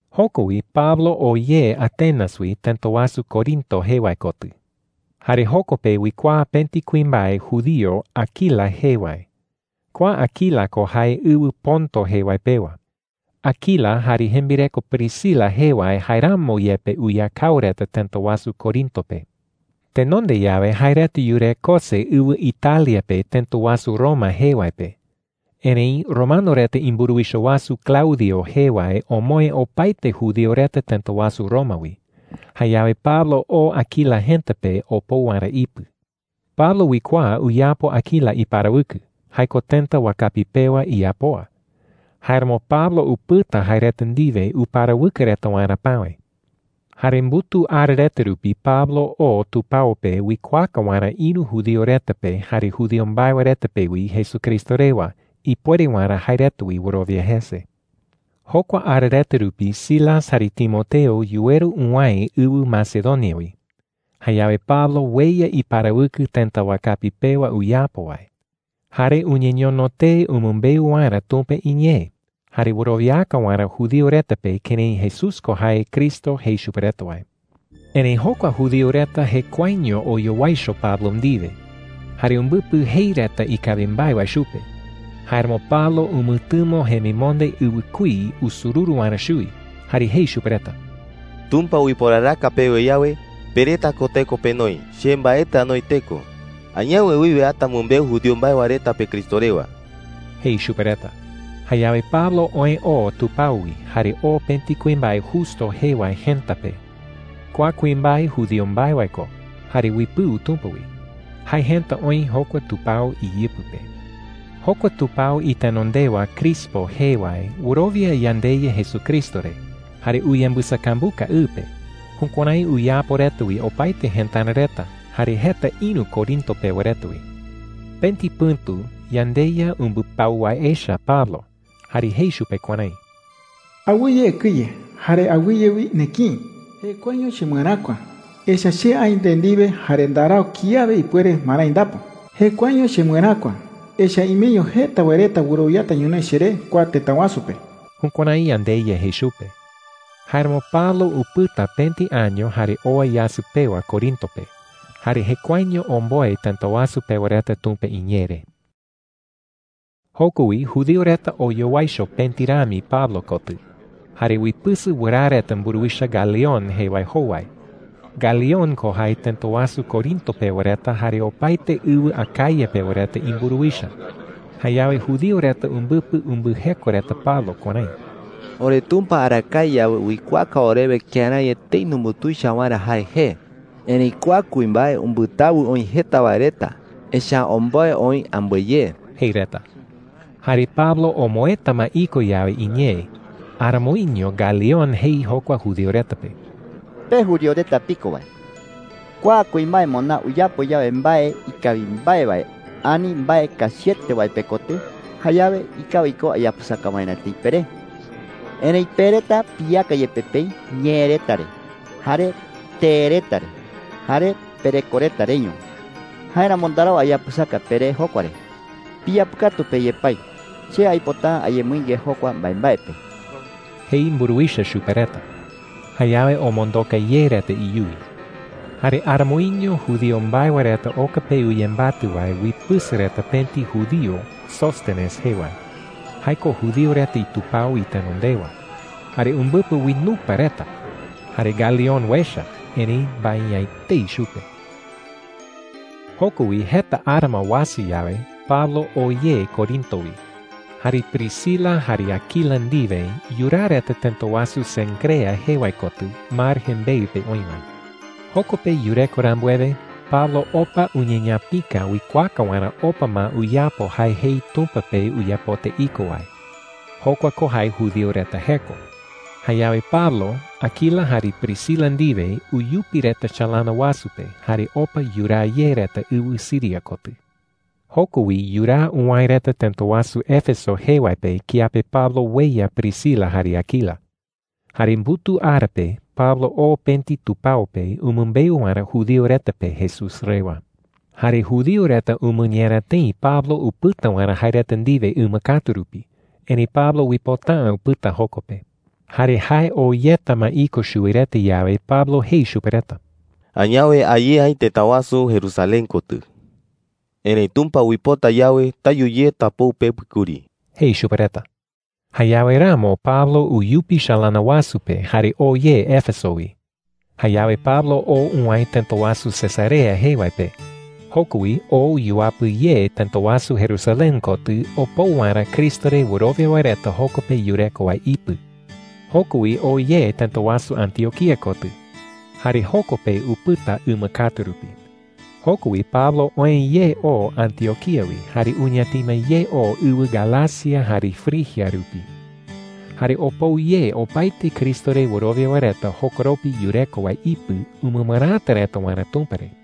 Joko wi Pablo oë oo Atenas wi tëta wasu Corinto jee wae kotɨ. Jare joko pe uikuaa pëti kuimbae judío Aquila jee wae. Kua Aquila ko jae ɨwɨ Ponto jee wae pewa. Aquila jare jembireko Priscila jee wae jaeramo yepe uyakao reta tëta wasu Corinto pe. Tenonde yawe, jae reta yurekose ɨwɨ Italia pe tëta wasu Roma jee wae pe. Erëi romano reta imburuwicha wasu Claudio jee wae omoë opaete judío reta tëta wasu Roma wi. Jayawe Pablo oo Aquila jëta pe opou waerä ipɨ. Pablo uikuaa uyapo Aquila iparawɨkɨ – jae ko tëta wakapi pewa iyapoa. Jáeramo Pablo upɨta jae reta ndiwe uparawɨkɨ reta waerä päwe. Jare mbutuu ara reta rupi Pablo oo tupao pe uikuaaka waerä ïru judío reta pe jare judío mbae wae reta pe wi Jesucristo rewa, ipuere waerä jae reta wi wɨrowia jese. Jokua ara reta rupi Silas jare Timoteo yuweru uwäe ɨwɨ Macedonia wi. Jayawe Pablo ueya iparawɨkɨ tëta wakapi pewa uyapo wae. Jare uñeñono tee umɨmbeu waerä Tumpa iñee jare wɨrowiaka waerä judío reta pe kërái Jesús ko jae Cristo jei chupe reta wae. Erëi jokua judío reta jekuaeño oyowaicho Pablo ndiwe, jare umbɨpɨ jei reta ikawi mbae wae chupe. Jáeramo Pablo umɨtɨmo jemimonde ɨwɨkuí usururu waerä chuwi, Arakae rupi jukuärái uyapo Tumpa iñee umɨmbeu wae reta kía uipota’ä uyapɨsaka jese reta yawe. jare jei chupe reta: “Tumpa uiporaraka pewe yawe, pe reta ko teko penoi. Che mbaetɨ anoi teko. Añawe wiwe ata amɨmbeu judío mbae wae reta pe Cristo rewa,” jei chupe reta. Jayawe Pablo oë oo tupao wi jare oo pëti kuimbae Justo jee wae jëta pe. Kua kuimbae judío mbae wae ko jare uipɨu Tumpa wi. Jae jëta oï jokua tupao iyɨpɨ pe. Jokua tupao itenondewa Crispo jee wae wɨrowia yandeYa Jesucristo re jare uyembɨsakambuka ɨ pe. Jukuärái uyapo reta wi opaete jëtara reta, jare jeta ïru Corinto pewa reta wi. Pëti pɨ̈tu yandeYa umbɨpau wae echa Pablo, jare jei chupe kuärái: “Awɨye ekɨye jare awɨye wi nekïi,” jei. “Jekuaeño chemɨeräkua. Echa’ä che aï nde ndiwe jare ndarau kiawe ipuere marái ndapo,” jei. “Jekuaeño chemɨeräkua, echa’ä imeño jeta wae reta wɨrowiata ñonoï cheré kua tëta wasu pe.” Jukuärái yandeYa jei chupe. Jáeramo Pablo upɨta pëti año jare owa yasɨ pewa Corinto pe, jare jekuaeño omboe tëta wasu pewa reta Tumpa iñee re. Joko wi judío reta oyowaicho pëti rami Pablo kotɨ, jare uipɨsɨ wɨraa reta mburuwicha Galión jee wae jowai. Galión ko jae tëta wasu Corinto pewa reta jare opaete ɨwɨ Acaya pewa reta imburuwicha. Jayawe judío reta umbɨpɨ umbɨjeko reta Pablo kuärái: “OreTumpa arakae yawe uikuaaka orewe kërái etei numbutuicha waerä jae jee. Erëi kua kuimbae umbɨtawɨ oï jeta wae reta, echa’ä omboe oï ambɨe ye,” jei reta. Jare Pablo omoëta ma iko yawe iñee, aramoiño Galión jei jokua judío reta pe: “Pe judío reta piko wae, kua kuimbae moná uyapo yawe mbae ikawi mbae wae ani mbae kachiete wae pekotɨ, jayawe ikawi ko ayapɨsaka waerä tëi peré,” jei. “Erëi pe reta piyeaka yepe peï ñee reta re, jare tee reta re, jare pereko reta reño. Jáeramo ndarau ayapɨsaka peré jokua re. Piyapɨkatu pe yepái. Che aipota’ä ayemɨinge jokua mbaembae pe,” jei mburuwicha chupe reta. Jayawe omondoka ye reta iyuwi. Jare aramoiño judío mbae wae reta oka pe uyembatɨ wae uipɨsɨ reta pëti judío Sóstenes jee wae – jae ko judío reta itupao itenondewa. Jare umbɨpɨ uinupa reta. Jare Galión uecha, erëi mbae’ä etei chupe. Joko wi jeta ara ma uasa yawe, Pablo oo ye Corinto wi. Jare Priscila jare Aquila ndiwe yuraa reta tëta wasu Cencrea jee wae kotɨ mar jembeɨ pe oï wae. Joko pe yureko rambuewe, Pablo opa uñeñapika uikuaaka waerä opa ma uyapo jae jei Tumpa pe uyapota iko wae. Jokua ko jae judío reta jeko. Jayawe Pablo, Aquila jare Priscila ndiwe uyupi reta chalana wasu pe jare opa yuraa ye reta ɨwɨ Siria kotɨ. Joko wi yuraa uwäe reta tëta wasu Éfeso jee wae pe kiape Pablo ueya Priscila jare Aquila. Jare mbutuu ara pe Pablo oo pëti tupao pe umɨmbeu waerä judío reta pe Jesús rewa. Jare judío reta umɨñera tëi Pablo upɨta waerä jae reta ndiwe ɨma katu rupi, erëi Pablo uipota’ä upɨta joko pe. Jare jae oo yeta ma iko chuwi reta yawe, Pablo jei chupe reta: “Añawe a ye aï tëta wasu Jerusalén kotɨ,” jei. “Erëi Tumpa uipota yawe, tayu ye tapou pepɨ kuri,” jei chupe reta. Jayawe ramo Pablo uyupi chalana wasu pe jare oo ye Éfeso wi. Jayawe Pablo oo uwäe tëta wasu Cesarea jee wae pe. Joko wi oo yuapɨ ye tëta wasu Jerusalén kotɨ opou waerä Cristo re wɨrowia wae reta joko pe yureko wae ipɨ. Joko wi oo ye tëta wasu Antioquía kotɨ. Jare joko pe upɨta ɨma katu rupi. Joko wi Pablo oë ye oo Antioquía wi jare uñatima ye oo ɨwɨ Galacia jare Frigia rupi. Jare opou ye opaete Cristo re wɨrowia wae reta jokoropi yureko wae ipɨ umɨmɨräta reta waerä Tumpa re.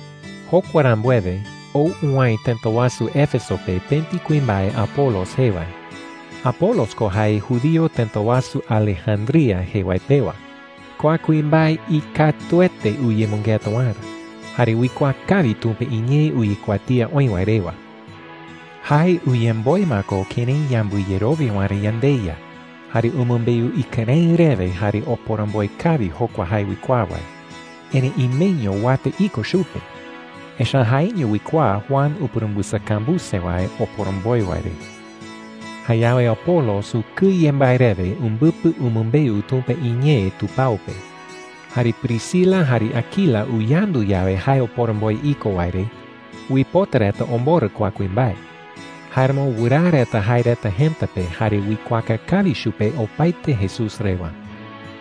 Jokua rambuewe, ou uwäe tëta wasu Éfeso pe pëti kuimbae Apolos jee wae. Apolos ko jae judío tëta wasu Alejandría jee wae pewa. Kua kuimbae ikatuete uyemɨngeta waerä, jare uikuaa kawi Tumpa iñee uyekuatía oï wae rewa. Jae uyemboe ma ko kërái yambɨyerowia waerä yandeYa, jare umɨmbeu ikɨrëɨ rewe jare oporomboe kawi jokua jae uikuaa wae. Erëi imeño uata iko chupe, echa’ä jaeño uikuaa Juan upurumbɨsakambuse wae oporomboe wae re. Jayawe Apolos ukɨye mbae rewe umbɨpɨ umɨmbeu Tumpa iñee tupao pe. Jare Priscila jare Aquila uyandu yawe jae oporomboe iko wae re, uipota reta omborɨ kua kuimbae. Jáeramo wɨraa reta jae reta jëta pe jare uikuaaka kawi chupe opaete Jesús rewa.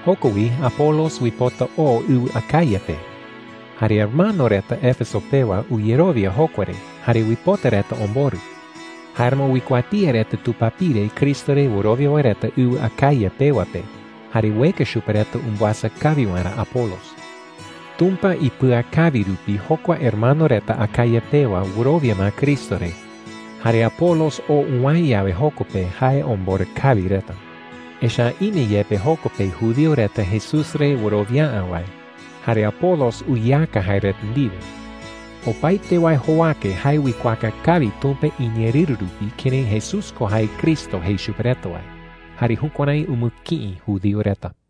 Joko wi Apolos uipota oo ɨwɨ Acaya pe. Jare hermano reta Éfeso pewa uyerowia jokua re jare uipota reta omborɨ. Jáeramo uikuatía reta tupapire Cristo re wɨrowia wae reta ɨwɨ Acaya pewa pe, jare ueka chupe reta umbɨasa kawi waerä Apolos. Tumpa ipɨakawi rupi jokua hermano reta Acaya pewa wɨrowia ma Cristo re. Jare Apolos oo uwäe yawe joko pe, jae omborɨ kawi reta. Echa’ä ime yepe joko pe judío reta Jesús re wɨrowia’ä wae, jare Apolos uyeaka jae reta ndiwe. Opaete wae jowake jae uikuaaka kawi Tumpa iñeerɨru rupi kërái Jesús ko jae Cristo jei chupe reta wae, jare jukuärái umɨkïi judío reta.